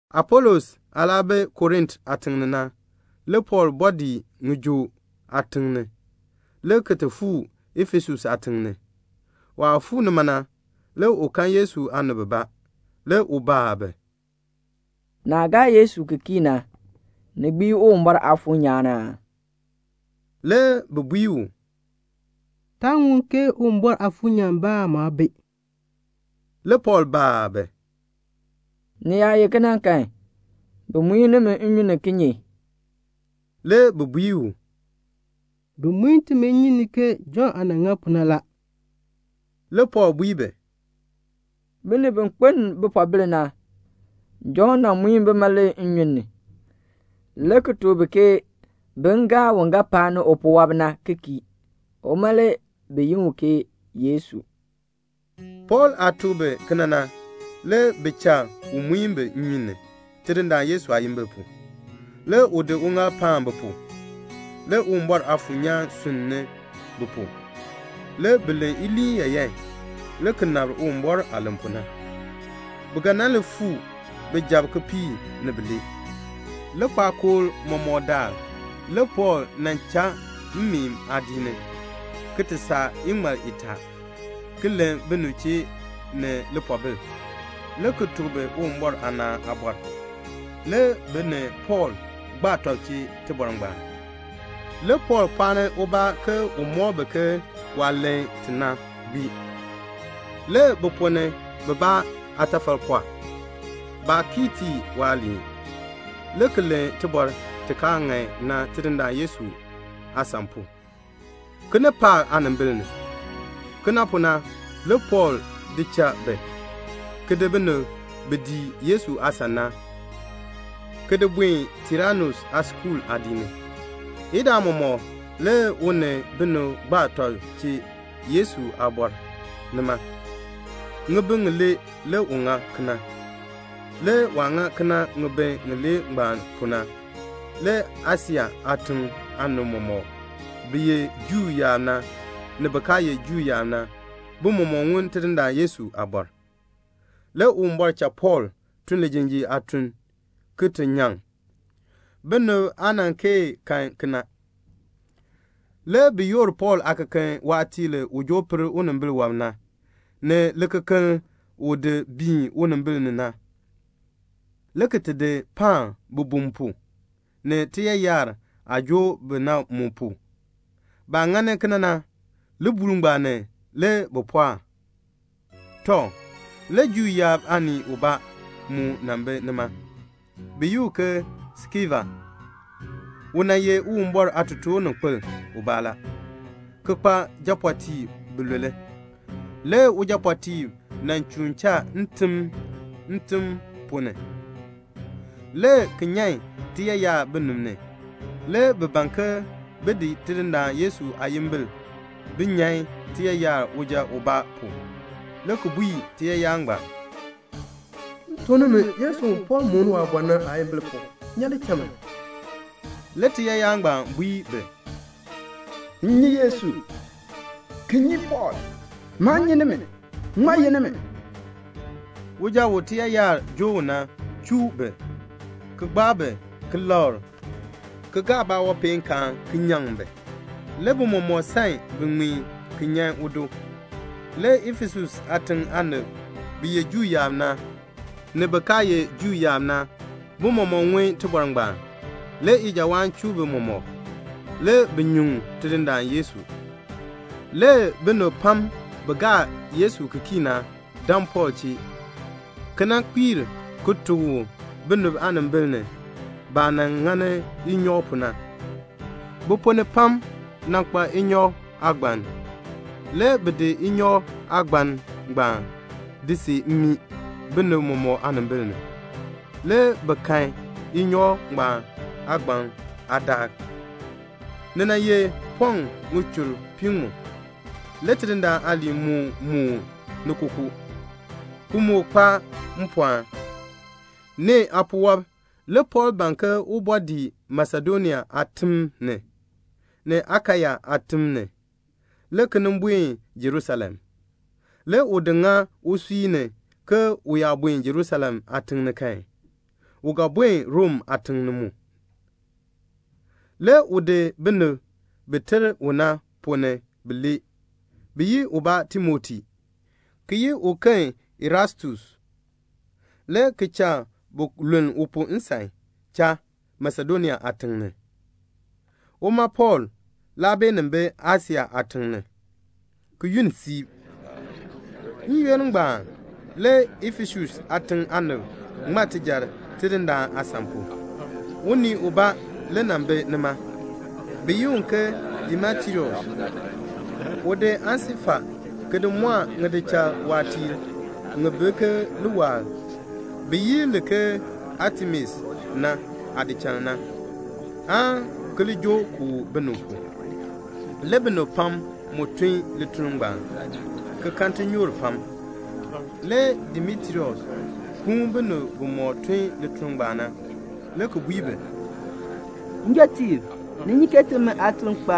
Apolos aah laa bi Korint aatiŋ ni na, le Pɔɔl bɔɔ dii ŋijoo aatiŋ ni, le ki ti fuu Efesus aatiŋ ni. Waah fuu nima na, le u kan Yesu aanib bibaa. Le u baa bi, "Naah gaa Yesu ki kii na, ni gbii Uwumbɔr Aafuur nyaan aa?" Le bi bui u, "Taa ŋun ke Uwumbɔr Aafuur nyaan bi aan mu aa bi." Le Pɔɔl baa bi, "Ni yaa ye kena kan, bi muin nimi nnyun ni kinye?" Le bi bui u, "Bi muin timi nnyun ni ke Jɔnn aah nan ŋa pu na la." Le Pɔɔl bui bi, "Binib bi kpeln bipoobil na, Jɔnn nan muin bima le nnyun ni, le ki tuk bi ke bin gaa un ga paani upuwɔb na ki kii. Uma le bi yi u ke Yesu." Pɔɔl aah tuk bi kena na, le bi cha u muin bi nnyun ni Tidindaan Yesu aayimbil pu. Le u di uŋaal paan bi pu. Le Uwumbɔr Aafuur nyaan sunn ni bi pu. Le bi len iliin yaayan, le ki nabr Uwumbɔr aah len pu na. Bi ga nan li fuu bijab kipiik ni bilee. Likpakool mɔmɔk daal le Pɔɔl nan cha mmeen aadiik ni, ki ti saa iŋmal itaa, ki len binib chee ni lipoobil, le ki tuk bi Uwumbɔr aanaan aabɔr. Le bi ni Pɔɔl gbaa tɔb chee tibɔr ngbaan. Le Pɔɔl pɔɔni ubaa ke un mɔk bi ke waah len ti na gbii. Le bi ponn ni bibaa aatafal pɔɔ. Baa kii tii waaliin, le ki len tibɔr ti kaa ŋan na Tidindaan Yesu aasan pu, kinipaak aanimbil ni. Kena pu na le Pɔɔl di cha bi, ki di binib bi dii Yesu aasan na, ki di buen Tiranus aaskuul aadiik ni. Idaa mɔmɔk le u ni binib gbaa tɔb chee Yesu aabɔr nima. Ŋibin ŋilee le u ŋa kena. Le waah ŋa kena ŋibin ŋilee ngbaan pu na, le Asia aatiŋ aanib mɔmɔk, bi ye Juu yaab na, ni bin kaa ye Juu yaab na, bi mɔmɔk ŋun Tidindaan Yesu aabɔr. Le Uwumbɔr cha Pɔɔl tun lijinjiir aatun ki ti nyaŋ. Binib aa nan kee kan kena. Le bi yoor Pɔɔl aakeken waatiir u joo per unimbil wɔb na, ni ŋikeken u di biin unimbiin ni na, le ki ti di paan bibum pu, ni tiyaayar aah joo bi na mu pu. Baah ŋani kena na, libuul ngbaan ni le bi pɔɔk. Tɔ, le Juu yaab aanii ubaa mu nan bi nima. Bi yi u ke Skeva. U nan ye Uwumbɔr aatotoorninkpil ubaa la, ki kpa japɔɔtiib bilule. Le ujapɔɔtiib nan chuun cha ntim ntim ponn ni, le ki nyan tiyaayar binib ni. Le bi ban ke bin di Tidindaan Yesu aayimbil bin nyan tiyaayar uja ubaa pu, le ki bui tiyaayar ngbaan, "M tuk nimi Yesu u Pɔɔl mooni waabɔr na aayimbil pu, nyan li cha man." Le tiyaayar ngbaan bui bi, "M nyi Yesu, ki nyi Pɔɔl. Maa nyi nimi. Ŋmaa ye nimi?" Le uja u tiyaayar joo u na chuu bi, ki gbaa bi ki lakr, ki gaa baawanpeenkaan ki nyaŋ bi. Le bi mɔmɔk san bi ŋmeen ki nyan udo. Le Efesus aatiŋ aanib bi ye Juu yaab na, ni bin kaa ye Juu yaab na, bi mɔmɔk ŋun tibɔr ngbaan. Le ijawaan chuu bi mɔmɔk. Le bi nyuŋ Tidindaan Yesu. Le binib pam bi gaa Yesu ki kii na dan Pɔɔl chee, ki nan kpiir ki tuk u binib aanimbil ni, baah nan ŋani inyɔk pu na. Bi ponn ni pam nan kpa inyɔk aagban. Le bi di inyɔk aagban ngbaan di see mmii, binib mɔmɔk aanimbil ni. Le bi kahn inyɔk aagban ngbaan aadaak. Ni nan ye pɔŋ ŋichur piiŋmu. Le Tidindaan aaliin moo moon ni kookoo, ki moo kpa mpɔɔn. Nee aapuwɔb le Pɔɔl ban ke un bɔɔ dii Masedonia aatim ni, ni Akaya aatim ni, le ki nin buen Jerusalem. Le u di ŋa usui ni ke u yaa buen Jerusalem aatiŋ ni kan, u ga buen Rom aatiŋ mu ni. Le u di binib bi ter u na ponn ni bilee, bi yi ubaa ke Timoti, ki yi uken ke Erastus, le ki cha bi luln u pu nsan cha Masedonia aatiŋ ni. Uma Pɔɔl laa beenin bi Asia aatiŋ ni, ki yunn siib. N-yoonn ngbaan le Efesus aatiŋ aanib ŋma tijar Tidindaan aasan pu. Unii ubaa le nan bi nima, bi yi u ke Demetrius. U di aansilfa ki di mɔɔ ŋidichal waatiir ŋi bi ke liwaal bi yi li ke Atemis na aadichal na, aan ki li joo kooh binib pu. Le binib pam mu tun lituln ngbaan, ki kan tinyoor pam. Le Demetrius kuun binib bimɔk tun lituln ngbaan na, le ki bui bi, "Njɔtiib, ni nyi ke timi aatuln kpa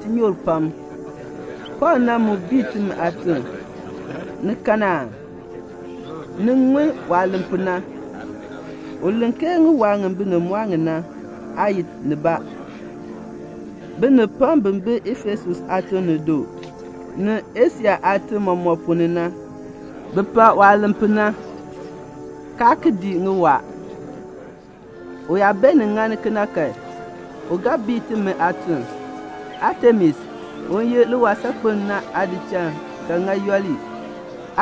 tinyoor pam. Pɔɔl na mu bii timi aatuln. Ni kan aa? Ni ŋun waah len pu na. U len ke ŋiwaa ŋi binib mɔɔ ŋi na aa ye nibaa. Binib pam bi bi Efesus aatiŋ ni du, ni Asia aatim mɔmɔk ponn ni na, bi pak waah len pu na, kaa ki dii ŋiwaa. U yaa beenin ŋani kena kan, u ga bii timi aatuln. Atemis, u ye liwaal saakpeln na aadichal ga ŋa yooli.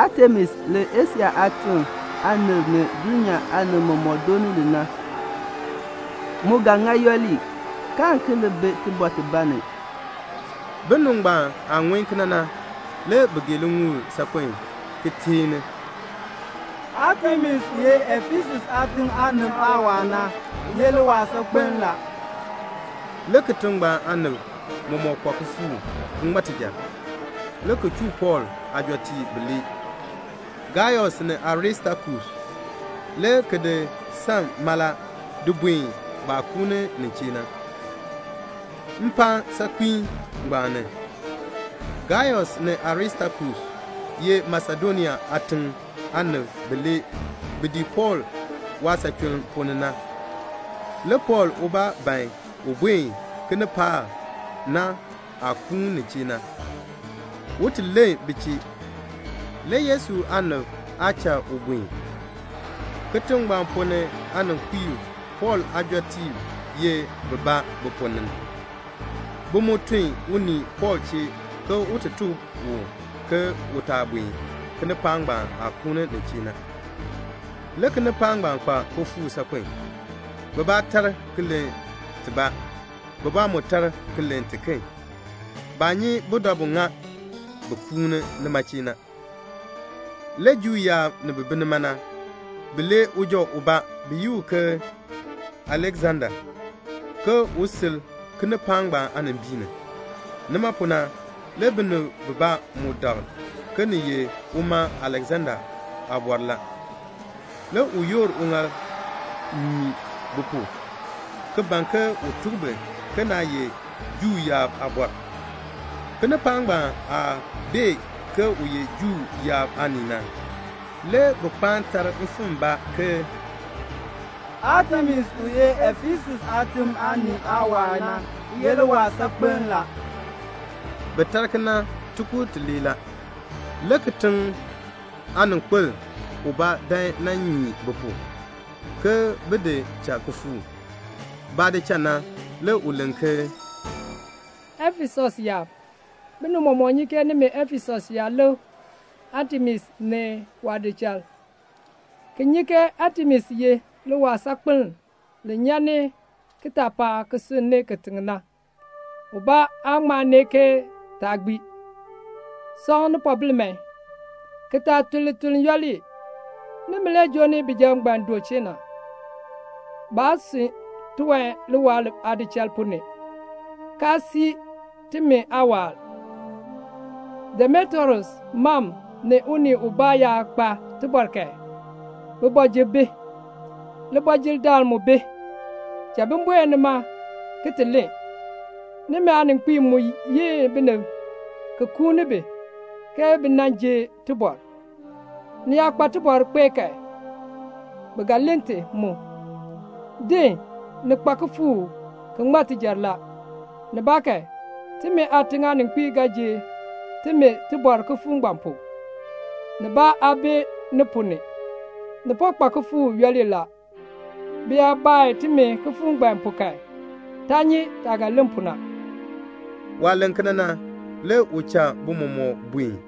Atemis li Asia aatim aanib ni dulnyaa aanib mɔmɔk dooni li na, mu ga ŋa yooli, kaan ki li bi tibɔr tibaa ni." Binib ngbaan aah ŋun kena na, le bi gee liŋuul saakpen, ki teeni, "Atemis u ye Efesus aatiŋ aanib aawaal na ye liwaal saakpeln la." Le kitiŋ ngbaan aanib mɔmɔk kpa kifuuk ki ŋma tijar, le ki chuu Pɔɔl aajɔtiib bilee, Gaius ni Aristakus, le ki di san mala di buen baah kuuni nin chee na, mpaan saakpiin ngbaan ni. Gaius ni Aristakus ye Masedonia aatiŋ aanib bilee bi dii Pɔɔl waasachuln ponn ni na. Le Pɔɔl ubaa ban un buen kinipaak na aah kuun nin chee na, un ti len bi chee. Le Yesu aanib aa cha u buen. Kitiŋ ngbaan ponn ni aaninkpiib Pɔɔl aajɔtiib ye bibaa bi ponn ni. Bi mu tun unii Pɔɔl chee ke un ti tuk u ke u taa buen kinipaak ngbaan aah kuun nin chee na. Le kinipaak ngbaan kpa kifuuk saakpen. Bibaa tar ki len tibaa, bibaa mu tar ki len tiken. Baa nyi budabu ŋa bi kuun nima chee na. Le Juu yaab bi bi nima na, bi lee uja ubaa bi yi u ke Aleksanda, ke un sil kinipaak ngbaan aanimbiin ni. Nima pu na, le binib bibaa mu dak ke ni ye uma Aleksanda aabɔr la. Le u yoor uŋaal nyii bi pu, ki ban ke un tuk bi ke naa ye Juu yaab aabɔr. Kinipaak ngbaan aah bee ke u ye Juu yaab aanii na, le bi kpaan tar mfimbaabaa ke, "Atemis u ye Efesus aatiŋ aanib aawaal na ye liwaal saakpeln la." Bi tar kena tikur tilee la. Le kitiŋ aaninkpil ubaa dan nan nyii bi pu, ke bi di cha kifuuk. Baah di cha na, le u len ke, "Efesus yaab, binib mɔmɔk nyi ke nimi Efesus yaab lik Atemis ni waadichal, ki nyi ke Atemis ye liwaal saakpeln li nyan ni kitaapaak ki sunn ni kitiŋ na. Ubaa aa ŋma nee ke taa gbii. Sɔŋ nipoobil man, ki taa tun lituln yooli. Nimi le joo ni bijab ngbaan du chee na. Baa sun tiwan liwaal aadichal ponn ni, kaa sii timi aawaal. Demetrius mam ni unii ubaa yaa kpa tibɔr kan, kooti bi, kootidaal mu bi, bibɔjir mu bi. Bin buen nima ki ti len. Nimi aaninkpiib mu yi binib ki kuuni bi, ke bi nan ji tibɔr. Ni yaa kpa tibɔr kpee kan, bi ga len ti mu. Din, ni kpa kifuuk ki ŋma tijar la. Nibaakan, timi aatiŋ aaninkpiib ga ji timi tibɔr kifuuk ngbaan pu. Nibaa aa bi ni ponn ni. Ni po kpa kifuuk yooli la. Bi yaa baa timi kifuuk ngbaan pu kan, taa nyi taah ga len pu na." Waah len kena na, le u cha bi mɔmɔk buen.